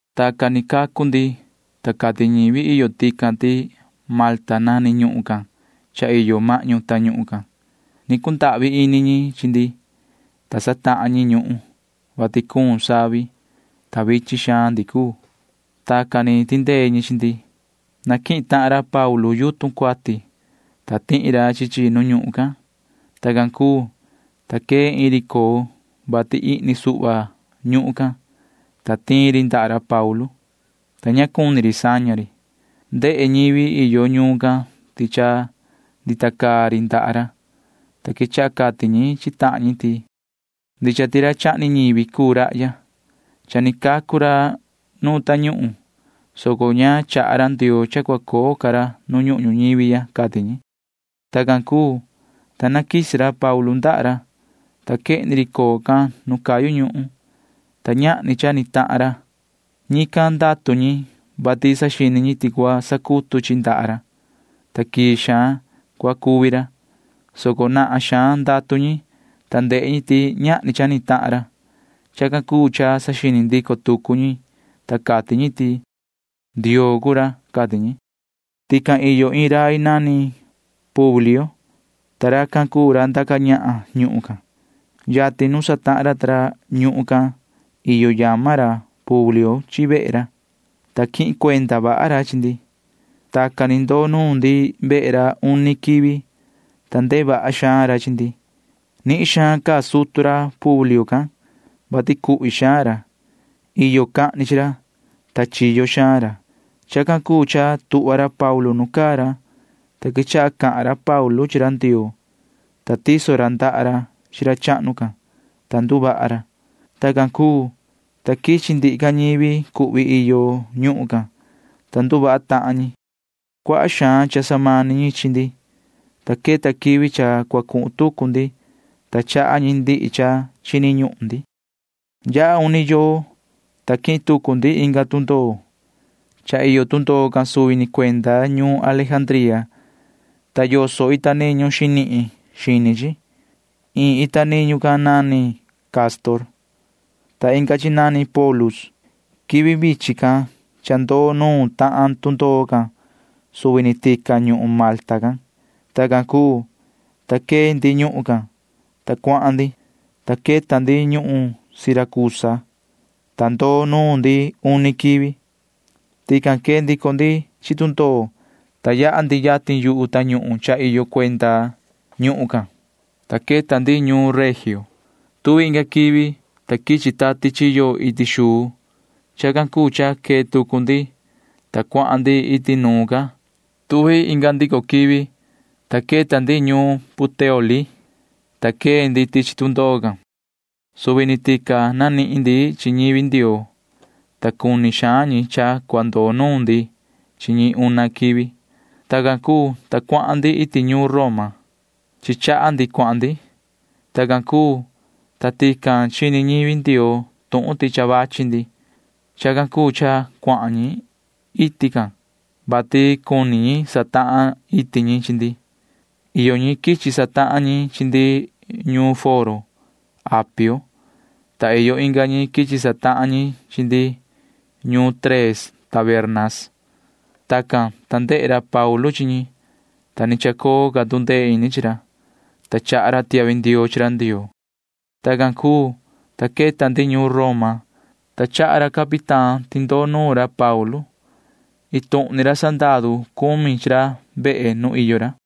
Tacan ni cacu ndi, ta cati ñivi iyo tican ti Malta nani ñuhun can cha iyo mahñu tañuhun can. Ni cundahvi ini ñi chi ndi, ta satahan ñi ñuhun, vati cuun savi, ta vichin xaan ndi cuu. Tacan ni tindee ñi chi ndi. Naquihin tahan ra Paulu yutun cuati, ta tihi ra chi chi nu ñuhun can. Tacan cuu, ta quee iin ri coo, vati ihni suhva ñuhun can, ta tiin ri ndaha ra Paulu, ta ña cuni ri saña ri. Ndehe ñivi iyo ñuun can ti cha ndita caa ri ndaha ra, ta quechaha cati ñi chi tahan ñi ti: ―Ndicha ti ra chahni ñivi cuu rahya. Cha ni cacu ra nuun tañuhun, soco ña chaha ra Ndioo cha cua coo ca ra nu ñuhun ñuñivi ya ―cati ñi. Tacan cuu, ta naquisi ra Paulu ndaha ra, ta quehni ri coo can nu cayu ñuhun, ta ñahni cha ni tahan ra. Ñican ndatu ñi, vati saxini ñi ti cua sacutu chi ndaha ra, ta quii xaan cua cuvi ra, soco nahan xaan ndatu ñi, ta ndehe ñi ti ñahni cha ni tahan ra. Chacan cuu cha saxini ndico tucu ñi, ta cati ñi ti: ―Ndioo cuu ra ―cati ñi. Tican iyo iin rai nani Publio, ta racan cuu ra ndaca ñahan ñuhun can. Yatin nu satahan ra ta ra ñuhun can iyo yama ra Publio chi vehe ra, ta quihin cuenda vaha ra chi ndi. Tacan ni ndoo nuun ndi vehe ra uni quivi, ta ndehe vaha xaan ra chi ndi. Nihin xaan caa sutu ra Publio can, vati cuhvi xaan ra. Iyo cahni chi ra, ta chiyo xaan ra. Chacan cuu cha tuhva ra Paulu nu caa ra, ta quechaha cahan ra Paulu chi ra Ndioo, ta tiso ra ndaha ra chi ra chahnu can, ta nduvaha ra. Tacan cuu, ta quichi ndihi ca ñivi cuhvi iyo ñuhun can, ta nduvaha tahan ñi. Cuaha xaan cha samani ñi chi ndi, ta queta quivi cha cua cuhun tucu ndi, ta chaha ñi ndihi cha chini ñuhun ndi. Yaha uni yoo, ta quihin tucu ndi inga tundoo. Cha iyo tundoo can suvi ni cuenda ñuun Alejandría, ta yoso ita niñu xinihin xini chi. Iin ita niñu can nani Cástor, ta inga chi nani Pólux. Quivi vichin can cha ndoo nuun tahan tundoo can suvi ni tican ñuhun Malta can. Tacan cuu, ta quee ndi ñuhun can, ta cuahan ndi, ta queta ndi ñuun Siracusa, ta ndoo nuun ndi uni quivi. Tican quee ndico ndi chi tundoo, ta yaha ndi yatin yu tañuhun cha iyo cuenda ñuhun can, ta queta ndi ñuun Regio. Tuvi inga quivi, ta quichi tati chiyo iti xuu. Chacan cuu cha quee tucu ndi, ta cuahan ndi iti nuun ca. Tuvi inga ndico quivi, ta queta ndi ñuun Puteoli, ta quee ndi tichi tundoo can. Suvi ni tican nanihin ndi chi ñivi Ndioo, ta cuni xaan ñi cha cua ndoo nuun ndi chi ñi una quivi. Tacan cuu, ta cuahan ndi iti ñuun Roma. Chi chaha ndi cuahan ndi. Tacan cuu, ta tican chini ñivi Ndioo tuhun ti cha vachi ndi. Chacan cuu cha cuahan ñi iti can, vati cuni satahan iti ñi chi ndi. Iyo ñi quichi satahan ñi chi ndi ñuun Foro Apio, ta iyo inga ñi quichi satahan ñi chi ndi ñuun Tres Tabernas. Tacan, ta ndehe ra Paulu chi ñi, ta ni chacoo ca tu ndee ini chi ra, ta chaha ra tiahvi ndioo chi ra Ndioo. Tacan cuu, ta queta ndi ñuun Roma, ta chaha ra capitán ti ndoo nuna ra Paulu. Iin tuhun ni ra sandaru cumi chi ra vehe nu iyo ra.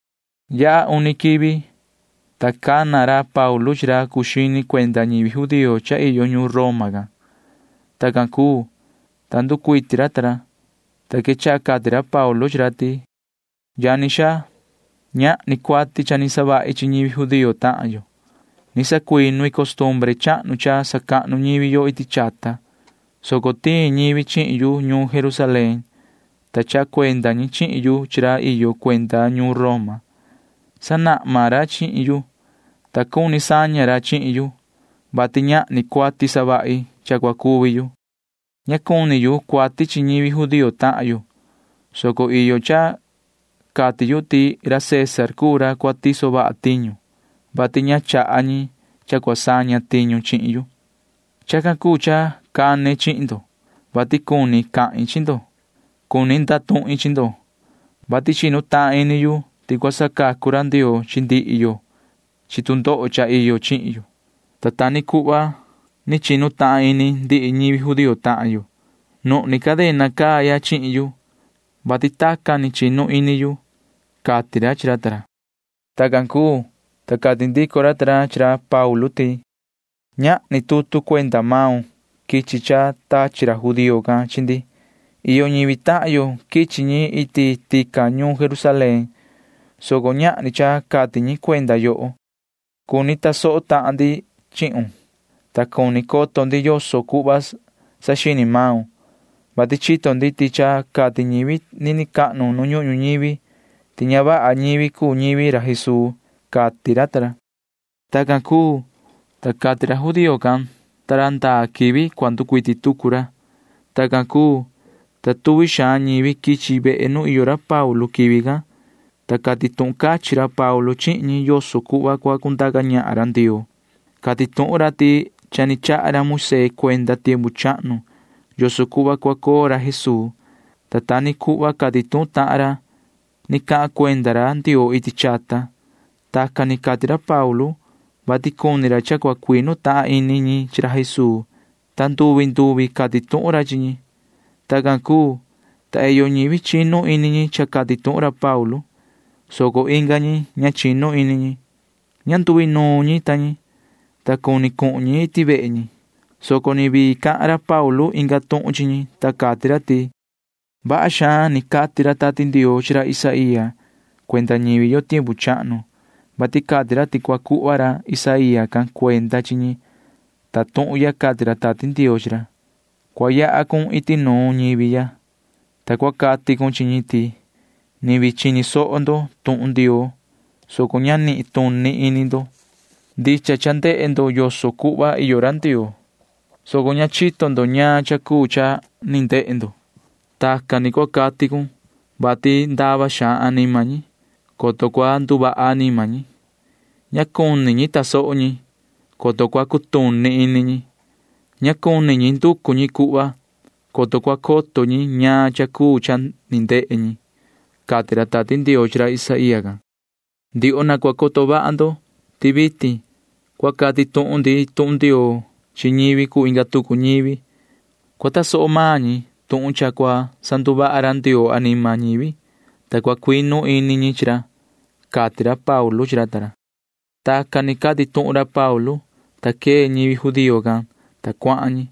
Yaha uni quivi, ta cana ra Paulu chi ra cuu xini cuenda ñivi judío cha iyo ñuun Roma can. Tacan cuu, ta nducuiti ra ta ra, ta quechaha cati ra Paulu chi ra ti: ―Yani xaa, ñahni cuati cha ni savahi chi ñivi judío tahan yo. Ni sacuinu i costumbre chahnu cha sacahnu ñivi yo iti chata, soco tiin ñivi chihin yu ñuun Jerusalén, ta chaha cuenda ñi chihin yu chi ra iyo cuenda ñuun Roma. Sanahma ra chihin yu, ta cuni saña ra chihin yu, vati ñahni cuati savahi cha cua cuvi yu. Ña cuni yu cuati chi ñivi judío tahan yo, soco iyo cha cati yu ti ra César cuu ra cua tiso vaha tiñu, vati ña chaha ñi cha cua saña tiñu chihin yu. Chacan cuu cha cane chihin ndo, vati cuni cahin chi ndo. Cuni ndatuhin chi ndo, vati chinu tahan ini yu ti cua sacacu ra Ndioo chi ndihi yo chi tu ndoho cha iyo chihin yo, ta ta ni cuhva ni chinu tahan ini ndihi ñivi judío tahan yo. Nuhni cadena caa ya chihin yu, vati tacan ni chinu ini yu ―cati ra chi ra ta ra. Tacan cuu, ta cati ndico ra ta ra chi ra Paulu ti: ―Ñahni tutu cuenda maun quichi cha tachi ra judío can chi ndi. Iyo ñivi tahan yo quichi ñi iti tican ñuun Jerusalén, soco ñahni cha cati ñi cuenda yoho. Cuni tasoho tahan ndi chihun, ta cuni coto ndi yoso cuhva saxini maun, vati chito ndi ti cha cati ñivi nini cahnu nu ñuhun ñuñivi ti ña vaha ñivi cuu ñivi ra Jesuu ―cati ra ta ra. Tacan, ta cati ra judío can ta ra ndaa quivi cua nducuiti tucu ra. Tacan cuu, ta tuvi xaan ñivi quichi vehe nu iyo ra Paulu quivi can, ta cati tuhun cachin ra Paulu chihin ñi yoso cuhva cua cundaca ñahan ra Ndioo. Cati tuhun ra ti cha ni chaha ra Moisee cuenda tiempu chahnu yoso cuhva cua coo ra Jesuu, ta ta ni cuhva cati tuhun tahan ra ni cahan cuenda ra Ndioo iti chata. Tacan ni cati ra Paulu, vati cuni ra cha cua cuinu tahan ini ñi chi ra Jesuu, ta nduvi nduvi cati tuhun ra chi ñi. Tacan cuu, ta iyo ñivi chinu ini cha cati tuhun ra Paulu, soco inga ñi ña chinu ini ñi. Ña nduinuun ñi ta ñi, ta cuni cuhun ñi iti vehe ñi, soco ni vii cahan ra Paulu inga tuhun chi ñi, ta cati ra ti: ―Vaha xaan ni cati ra Tati Ndioo chi ra Isaía cuenda ñivi yo tiempu chahnu, vati cati ra ti cua cuhva ra Isaía can cuenda chi ñi, ta tuhun ya cati ra Tati Ndioo chi ra: Cua yaha cun iti nuun ñivi ya, ta cua cati cun chi ñi ti ni vii chini soho ndo tuhun Ndioo, soco ña nituni ini ndo. Ndicha cha ndehe ndo yoso cuhva iyo ra Ndioo, soco ña chito ndo ñaan cha cuu cha ni ndehe ndo. Tacan ni cua cati cun, vati ndava xaan anima ñi, coto cua nduvaha anima ñi. Ña cuni ñi tasoho ñi, coto cua cutuni ini ñi. Ña cuni ñi nducu ñi cuhva, coto cua coto ñi ñaan cha cuu cha ni ndehe ñi, cati ra Tati Ndioo chi ra Isaía can. Ndioho na cua coto vaha ndo ti vitin cua cati tuhun ndi tuhun Ndioo chi ñivi cuu inga tucu ñivi. Cua tasoho maan ñi tuhun cha cua sanduvaha ra Ndioo anima ñivi, ta cua cuinu ini ñi chi ra ―cati ra Paulu chi ra ta ra. Tacan ni cati tuhun ra Paulu, ta quee ñivi judío can, ta cuahan ñi.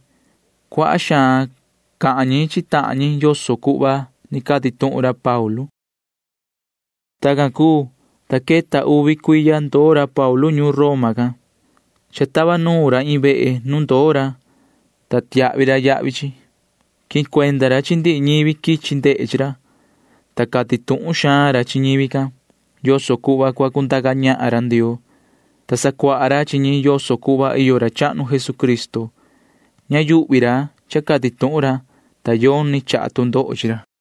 Cuaha xaan cahan ñi chi tahan ñi yoso cuhva ni cati tuhun ra Paulu. Tacan cuu, ta queta uvi cuiya ndoo ra Paulu ñuun Roma can. Cha tava nuun ra iin vehe nu ndoo ra, ta tiahvi ra yahvi chi. Quihin cuenda ra chi ndihi ñivi quichi ndehe chi ra, ta cati tuhun xaan ra chi ñivi can yoso cuhva cua cundaca ñahan ra Ndioo, ta sacuaha ra chi ñi yoso cuhva iyo ra chahnu Jesucristo. Ña yuhvi ra cha cati tuhun ra, ta yoni chaha tu ndoho chi ra.